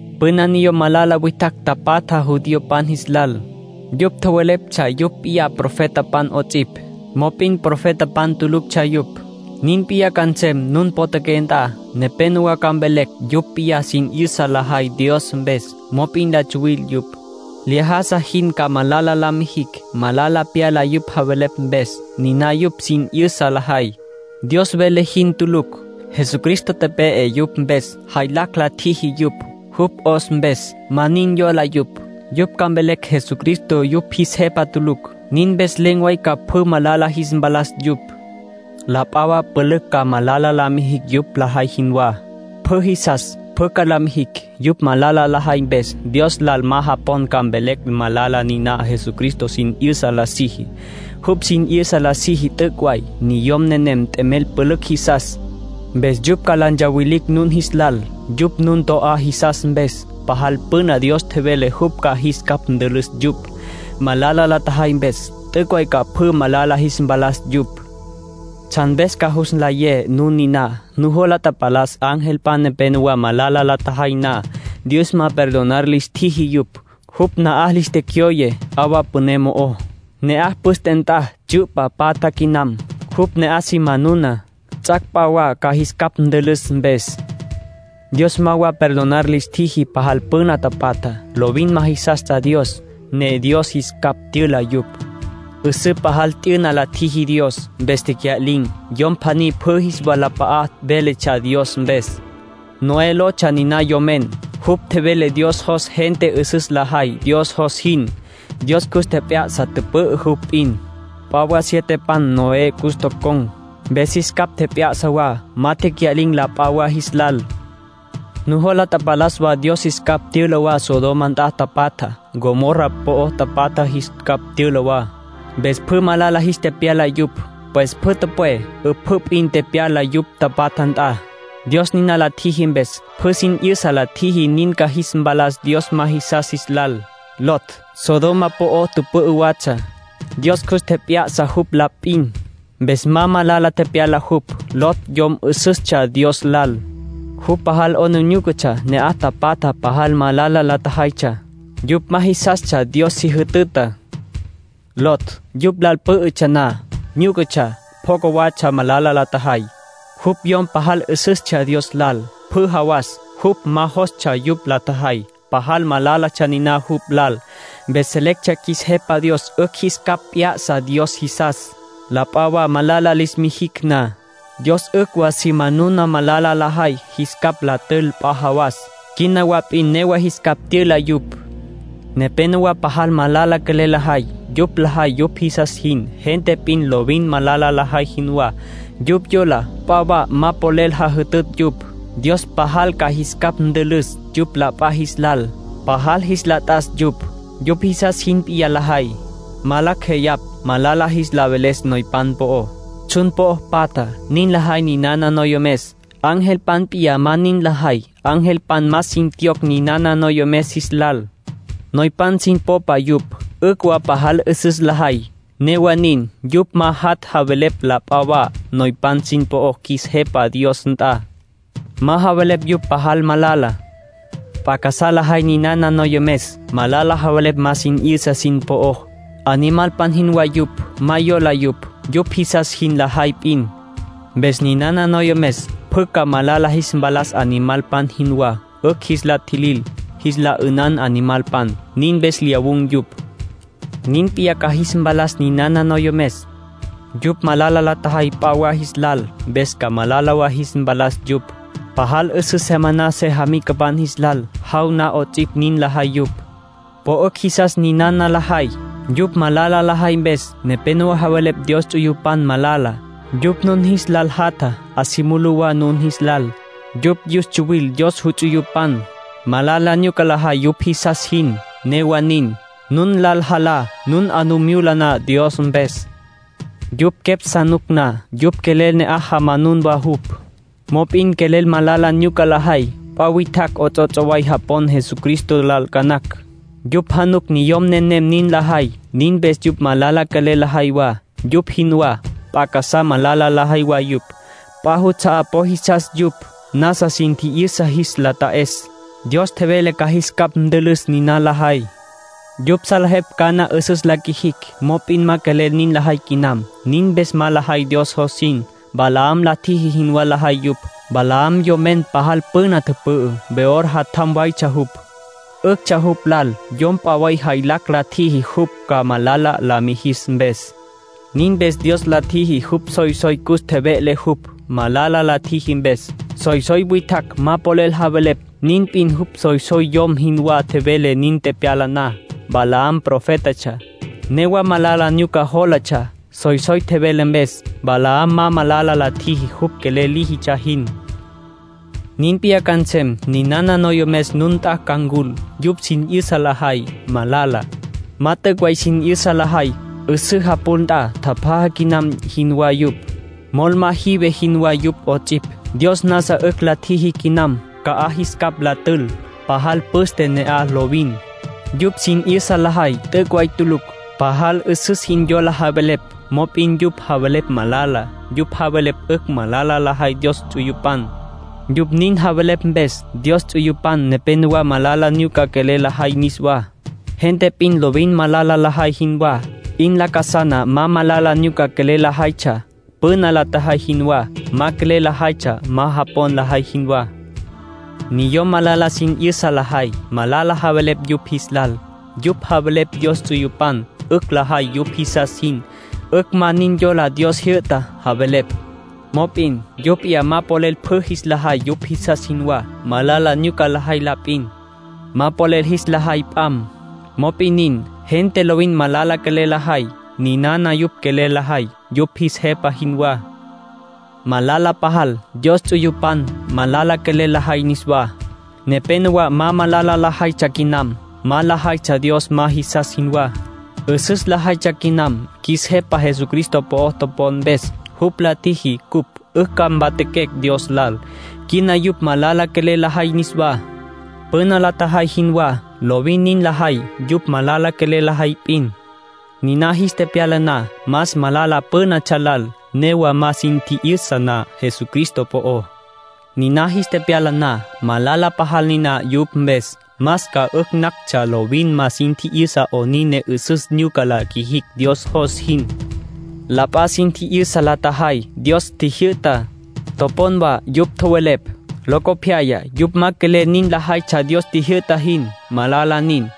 Püna niyom malala witjacj tapatja judiopan jis lal. Yupj tjoweleptsja yupj p'iyá profetapan 'ots'ipj, mop'in profetapan tuluctsja yupj. Nin p'iyá ca nsem nun potjaqué nt'a. Nepénowa ca mvelecj yupj p'iyá sin 'yüsa lajay Dios mpes, mop'in la tsuwil yupj. Lyájasa jin ca malala la mijicj. Malala pyala yupj javelepj mpes. Niná yupj sin 'yüsa lajay, Dios vele jin tulucj. Jesucristo tepe'e yupj mpes. Jaylacj la tjiji yupj, jupj 'os mpes. Ma nin yola yupj. Yupj ca mvelecj Jesucristo yupj jis Jepa tulucj. Nin mpes len̈ way ca pjü malala jis mpalas yupj. La p'a wa pülücj ca malala la mijicj yupj lajay jinwá. Pjü jisas, pjü ca la mijicj. Yupj malala lajay mpes, Dios lal ma japon ca mvelecj malala niná Jesucristo sin 'yüsa la siji. Jupj sin 'yüsa la siji t'üc' way. Niyom nenem t'emel pülücj jisas, mpes yupj ca la ntsawilicj nun jis lal, yupj nun to'á jisas mpes. Pajal püna Dios tjevele jupj ca jis capj ntülüs yupj, malala la tjajay mpes. T'üc' way ca pjü malala jis mpalas yupj. Tsjan mpes ca jus nlayé nun niná: nujola tapalas angelpan nepenowá malala la tjajay na, Dios ma perdonar lis tjiji yupj. Jupj na'aj lis tecyoye 'awa püné mo'ó. Ne'aj püste nt'a tsyu'pa patja quinam. Jupj ne'aj si manuna, ts'ac' p'a wa ca jis capj ntülüs mpes. Dios ma wa perdonar lis tjiji pajal püna tapatjá. Lovin ma jisastsja Dios, ne Dios jis capj tyüla yupj. 'Üsǘ pajal t'yüna la tjiji Dios, mpes tecya'lin̈. Yom pjaní pjü jis walap'a'a véletsja Dios mpes. Noé lotsja niná yomen. Jupj tjevele Dios jos gente 'üsüs lajay Dios jos jin. Dios cus tjep'ya'sa tüpü'ü jupj p'in. P'a wa sietepan Noé cus tocon̈, mpes jis capj tjep'ya'sa wa. Ma tecya'lin̈ la p'a wa jis lal. Nujola tapalas wa Dios jis capj tyüla wa Sodoma nt'a tapatjá. Gomorra po'o tapatjá jis capj tyüla wa. Mpes pjü malala jis tepyala yupj. Pues pjü tüpwé, 'üpjǘ p'in tepyala yupj tapatja nt'a. Dios niná la tjiji mpes, pjü sin 'yüsa la tjiji nin ca jis mpalas Dios ma jisas jis lal. Lot Sodoma po'o tüpü'ü watsja. Dios cus tjep'ya'sa jupj la p'in, mpes ma malala tepyala jupj. Lot yom 'üsüstsja Dios lal. Jupj pajal 'aplijílatsja ne'aj tapatja pajal malala la tjajaytsja. Yupj ma jisastsja Dios si jütüta. Lot yupj lal pǘ'ütsja na, nyúcatsja, pjoca watsja malala la tjajay. Jupj yom pajal 'üsüstsja Dios lal. Pjü jawas, jupj ma jostsja yupj la tjajay. Pajal malálatsja niná jupj lal. Mpes selecj qjuis Jepa Dios 'ücj jis capj p'ya'sa Dios jisas, la p'a malala lis mijicj na. Dios 'ücj wa si manuna malala lajay, jis capj la tül p'a jawas. Quina wa p'in newa jis capj tyüla yupj. Nepénowa pajal malala quelel lajay. Yupj lajay yupj jisas jin, gente p'in lovin malala lajay jinwá. Yupj yola p'a wa ma polel jajütütj yupj. Dios pajal ca jis capj ntülüs yupj la p'a jis lal. Pajal jis la t'as yupj. Yupj jisas jin p'iyá lajay. Ma lacj jeyapj malala jis la veles noypan po'ó, tsjun po'ó patjá. Nin lajay ninana noyomes. Angelpan p'iyá ma nin lajay. Angelpan más sin tjiyocj ninana noyomes jis lal. Noypan sin popa yupj; 'ücj wa pajal 'üsüs lajay. Newa nin, yupj ma jat' javelepj la p'a wa noypan sin po'ó qjuis Jepa Dios nt'a. Ma javelepj yupj pajal malala. P'a casá lajay ninana noyomes. Malala javelepj ma sin 'yüsa sin po'ó. Animalpan jinwá yupj. Ma yola yupj. Yupj jisas jin lajay p'in. Mpes ninana noyomes pjü ca malala jis mpalas animalpan jinwá. 'Ücj jis la tjilil, jis la 'ünan animalpan. Nin mpes lyawun̈ yupj. Nin p'iyá ca jis mpalas ninana noyomes. Yupj malala la tjajay p'a wa jis lal, mpes ca malala wa jis mpalas yupj. Pajal 'üsǘ se maná sejamicapan jis lal. Jaw na 'ots'ipj nin lajay yupj. Po 'ücj jisas ninana lajay. Yupj malala lajay mpes, nepénowa javelepj Dios ts'uyupan malala. Yupj nun jis lal jatja, 'a si mulú wa nun jis lal. Yupj yus tsuwil Dios juts'uyupan. Malala nyuca lajay yupj jisas jin; newa nin, nun lal jalá, nun 'a nu myula na Dios mpes. Yupj quepj sa nuc na, yupj quelel ne'aj jamanun wa jupj. Mop'in quelel malala nyuca lajay. P'a witjacj 'ots'ots' way japon Jesucristo lal ca nacj. Yupj januc niyom nenem nin lajay. Nin mpes yupj malala quelel lajay wa, yupj jinwá. P'a casá malala lajay wa yupj. P'a juts'a'á po jisas yupj, nasa sin tji'yüsa jis la ta'es. Dios tjevele ca jis capj ntülüs, niná lajay. Yupj salejepj cana 'üsüs la qjuijicj, mop'in ma quelel nin lajay quinam. Nin mpes ma lajay Dios jos jin. Balaam la tjiji jinwá lajay yupj. Balaam yomen pajal püna tüpü'ü. Beor jatjam waytsja jupj. 'Üctsja jupj lal yom p'a way jaylacj la tjiji jupj ca malala la mijis mpes. Nin mpes Dios la tjiji jupj soysoy cus tjeve'le jupj, malala la tjiji mpes. Soysoy witjacj ma polel javelepj, nin p'in jupj soysoy yom jinwá tjevele nin tepyala na. Balaam profétatsja, newa malala nyuca jólatsja. Soysoy tjevele mpes, Balaam ma malala la tjiji jupj quelel líjitsja jin. Nin p'iyá ca nsem; ninana noyomes nun nt'a ca ncul. Yupj sin 'yüsa lajay, malala. Ma t'üc' way sin 'yüsa lajay. 'Üsǘ japul nt'a tjapjaja quinam jinwá yupj. Mol ma jive jinwá yupj 'ots'ipj. Dios nasa 'ücj la tjiji quinam ca'aj jis capj la tül. Pajal püste ne'aj lovin. Yupj sin 'yüsa lajay t'üc' way tulucj. Pajal 'üsüs jin yola javelepj, mop'in yupj javelepj malala. Yupj javelepj 'ücj malala lajay Dios ts'uyupan. Yupj nin javelepj mpes, Dios ts'uyupan nepenowá malala nyuca quelel lajay niswá, gente p'in lovin malala lajay jinwá. 'In lacasana ma malala nyuca quelel lajaytsja, püna la tjajay jinwá. Ma quelel lajaytsja ma japon lajay jinwá. Niyom malala sin 'yüsa lajay, malala javelepj yupj jis lal. Yupj javelepj Dios ts'uyupan 'ücj lajay yupj jisas jin. 'Ücj ma nin yola Dios jyü'tá, javelepj. Mop'in yupj p'iyá ma polel pjü jis la jay yupj jisas jinwá. Malala nyuca lajay la p'in. Ma polel jis la jay p'am. Mop'in nin. Gente lovin malala quelel lajay, ninana yupj quelel lajay yupj jis jepa jinwá. Malala pajal, Dios ts'uyupan malala quelel lajay niswá. Nepénowa ma malala lajaytsja quinam. Ma lajaytsja Dios ma jisas jinwá. 'Üsüs lajaytsja quinam, qjuis Jepa Jesucristo po'o topon mpes. Jupj la tjiji cupj 'ücj ca mpatjaquecj Dios lal. Quina yupj malala quelel lajay niswá, püna la tjajay jinwá. Lovin nin lajay yupj malala quelel lajay p'in. Niná jis tepyala na, más malala pǘnatsja lal, newa ma sin tji'yüsa na Jesucristo po'ó. Niná jis tepyala na, malala pajal niná yupj mpes. Más ca 'ücj nactsja lovin ma sin tji'yüsa 'onin ne 'üsüs nyuca la qjuijicj Dios jos jin. La p'a sin tji'yüsa la tjajay Dios tjijyü'tá. Topon wa yupj tjowelepj. Locopyaya yupj ma quelel nin lajaytsja Dios tjijyü'ta jin. Malala nin.